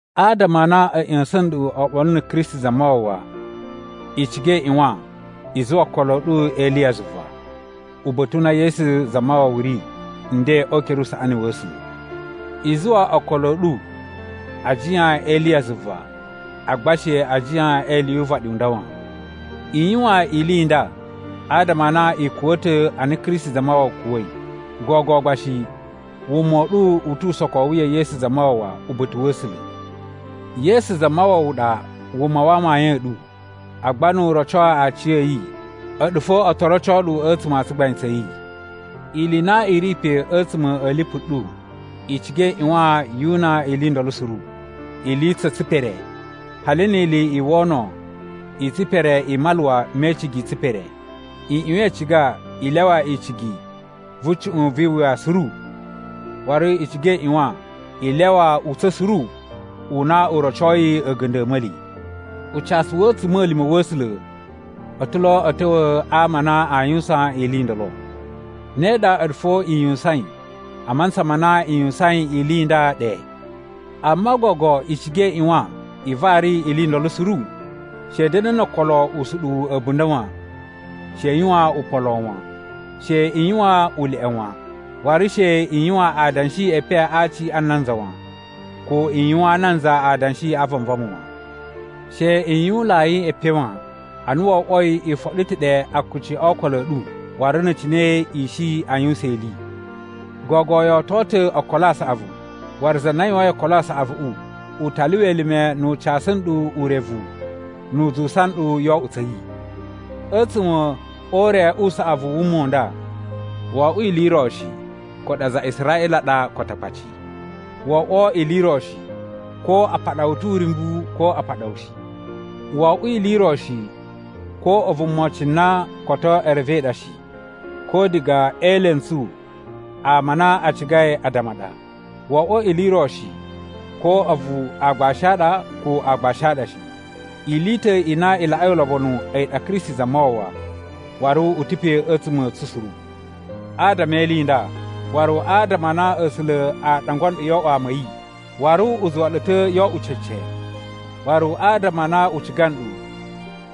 Adama a na a̱ ꞌya̱sa̱n nɗu oɓolo na̱ Kristi Zamawawa, i ciga i ꞌyuwan i zuwa okolo a̱ ɗu e ili ya zuva, uba̱ta̱ u na Yesu Zamawawa ri nden o ukere usaꞌani wa̱ A̱sula̱. I zuwa okolo a̱ ɗu a jiyan e ili ya zuva, agba she a jiyan e ili yu uvaɗi u nda wan. I yuwan ili i nda adama a na i kuwa̱ ta̱ ana Kristi Zamawawa kuwa̱i, gogo gba shi wuma u ɗu u tu usokowu ya̱ Yesu Zamawawa uba̱ta̱ wa̱ A̱sula̱. Yesu Zamawawa ɗa wuma wa amayun a̱ ɗu, agba nu u roco aciya̱yi, a̱ɗu fo o to roco ɗu a̱tsuma̱ a tsugbain tsa̱ yi. Ili i na i ri pe a̱tsuma̱ a̱ lipu ɗu, i ciga i ꞌyuwan yu una ili ndolo suru: ili tsa̱ tsipere, hali ni ili i wono i tsipere i maluwa me icigi i tsipere. I ꞌyuwan i ciga i lyawa icigi vu cuꞌun vi iwuya suru. Waru i ciga i ꞌyuwan i lyawa utsa̱n suru u na u rocoi a̱ga̱nda̱ a̱ a̱ma̱li. Ucasu wa̱ a̱tsuma̱lima̱ wa̱ A̱sula̱ o ta̱ lo a̱ ta̱wa̱ a ama a na aa yuwusan ili i ndolo. Ne ɗa a̱ɗu fo i yuwusain a mantsa ma na i yuwusain ili i nda ɗe. Amma gogo i ciga i ꞌyuwan i vari ili i ndolo suru. She i da̱na̱ no okolo usuɗuwu a̱bunda̱ wan. She i yuwan upan lon wan. She i yuwan uleꞌe wan. Waru she i yuwan adanshi e epen a aci a nanza wan, ko i yuwaan nanza adanshi a vanvama wan. She i yuwunlai epen wan, ana wo oꞌwoi i foɗo ta̱ ɗe akuci o okolo a̱ ɗu waru na̱ cine i shi a yuwusan ili. Gogo yo oto ta̱ okolo a saꞌavu waru za na yuwain okolo a saꞌavuꞌu u ta lyuwa elime nu u casu nɗu urevu nu u zuwusa nɗu yoo oꞌwo tsa̱ yi. A̱tsuma̱ o ure u saꞌavu u wuma u nda, wo oꞌwo ili i ro shi ko a̱ɗu aza a Israꞌila ɗa ko Atakpaci. Wo oꞌwo ili i ro shi ko a paɗa wu ta̱ uryumbu ko a paɗa wu shi. Wo oꞌwo ili i ro shi ko a̱vu mocin na koto e revei ɗa shi, ko diga e elentsu ama a na a cigai addama ɗa. Wo oꞌwo ili i ro shi ko a̱vu aagbashi a ɗa ko aagbashi a ɗa shi. Ili i ta̱ i na i laꞌai ulobonu a̱yi ɗa Kristi Zamawawa, waru u ta̱ pe a̱tsuma̱ a̱ tsu suru. Adama e ili nda, waru adama a na A̱sula̱ a ɗangwa nɗu yo oꞌwo ama a̱ yi, waru u zuwa ɗu ta̱ yo oꞌwo cece, waru adama a na u ciga nɗu,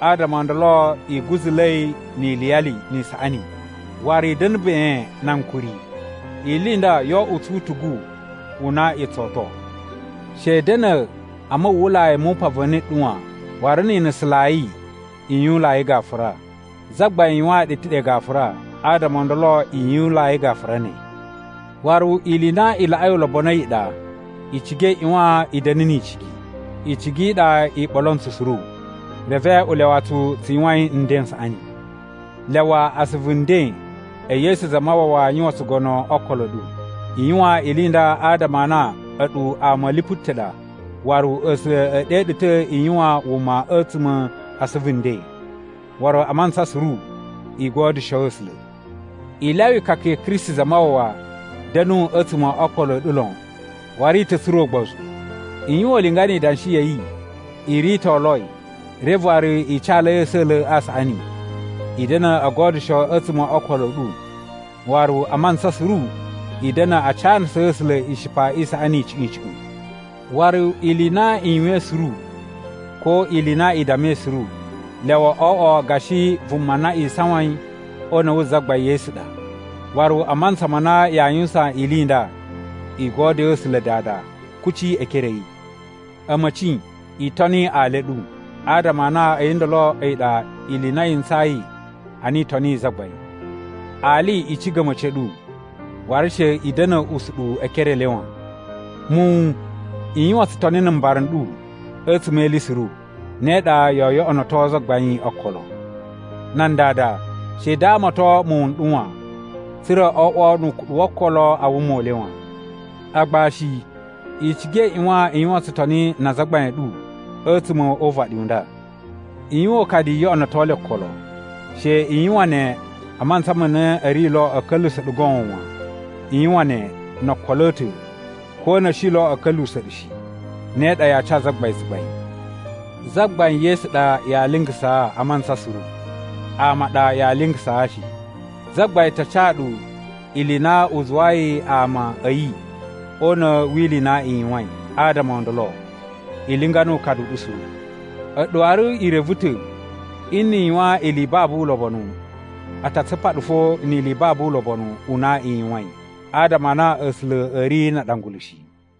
adama o ndolo i guzula̱i ni iliyali, ni isaꞌani. Waru i da̱na̱ ben na ankuri. Ili i nda yo oꞌwo tsu utugu u na i tso oto. She i da̱na̱ a muwwulai mu upan va̱ni ɗu wan, waru ni i nusunlai, i yuwunlai gafura. Zagbain yuwaan ɗu ta̱ ɗe gafura, adama o ndolo i yuwunlai gafura ne. Waru ili i na i laꞌai ulobonu a̱yi ɗa, i ciga i ꞌyuwan i da̱na̱ ni icigi. Icigi i ɗa i ɓolo ntsu suru, reve u lyawa tsu tsu yuwain nden n saꞌani. Lyawa asuvu nden e Yesu Zamawawa yuwan tsugono o okolo a̱ ɗu. I yuwan ili i nda adama a na a̱ɗu ama a̱ lipu ta̱ ɗa waru A̱sula̱ e ɗe ɗu ta̱ i yuwan wuma a̱tsuma̱ a asuvu nden. Waru a mantsa suru i godyusho A̱sula̱. I lyawa ikaka ya̱ Kristi Zamawawa da̱nu a̱tsuma̱ o okolo a̱ ɗu lon waru i ta̱ tsura̱ ugbozu. I yuwan ulinga ni idanshi ya̱ yi i ritoloi reve waru i calai a̱sa̱la̱ a saꞌani. I da̱na̱ o godyusho a̱tsuma̱ o okolo a̱ ɗu waru a mantsa suru i da̱na̱ a canasaa A̱sula̱ ishipa i saꞌani icuꞌun icuꞌun. Waru ili i na i yuwain suru ko ili i na i dammai suru, lyawa o oꞌwo gashi vuma na isawain o una̱ wu Zagbain Yesu ɗa. Waru a mantsa ma na yaa yuwusan ili i nda, i godyoo A̱sula̱ Dada kuci e ekere a̱ yi. A̱ma̱ci, i toni ali a̱ ɗu, adama a na a̱yi ndolo a̱yi ɗa ili i na yi ntsayi ana i toniyi Zagbain. Ali, i ciga a̱ma̱ci a̱ ɗu, waru she i da̱na̱ usuɗuwu e ekere e le wan. Muwun, i yuwan tsutoni na̱ mbara n ɗu a̱tsuma̱ e ili suru, ne ɗa yoo yoꞌonoto Zagbain okolo. Nan dada, she i damaton muwun n ɗu wan, tsa̱ra̱ o oꞌwo nu ukuɗu wo okolo a wuma u le wan. Agbashi, i ciga i ꞌyuwan i yuwan tsutoni na azagbain a̱ ɗu a̱tsuma̱ o uvaɗi u nda. I yuwan ukadu i yoꞌonoto le okolo. She i yuwan ne a mantsa ma na a̱ ri lo a̱ ka̱lyuwusa̱ ɗu goon wan. I yuwan ne no okolo a̱ ta̱ ko na̱ a̱ shi lo a̱ ka̱lyuwusa̱ ɗu shi. Ne ɗa ya ca Zagbain tsugbain. Zagbain Yesu ɗa yaa lingasaa a mantsa suru. Ama a ɗa yaa lingasaa shi. Zagbain ta ca ɗu ili i na u zuwayi ama a̱ yi o una̱ wi ili i na i yuwain. Adama o ndolo, i linga nu ukadu u ɗu suru. A̱ɗu waru i reve ta̱ nni i yuwan ili i babu ulobonu, a ta tsupa ɗu fo ni ili i babu ulobonu u na i yuwain. Adama a na A̱sula̱ a̱ ri na aɗangulu shi.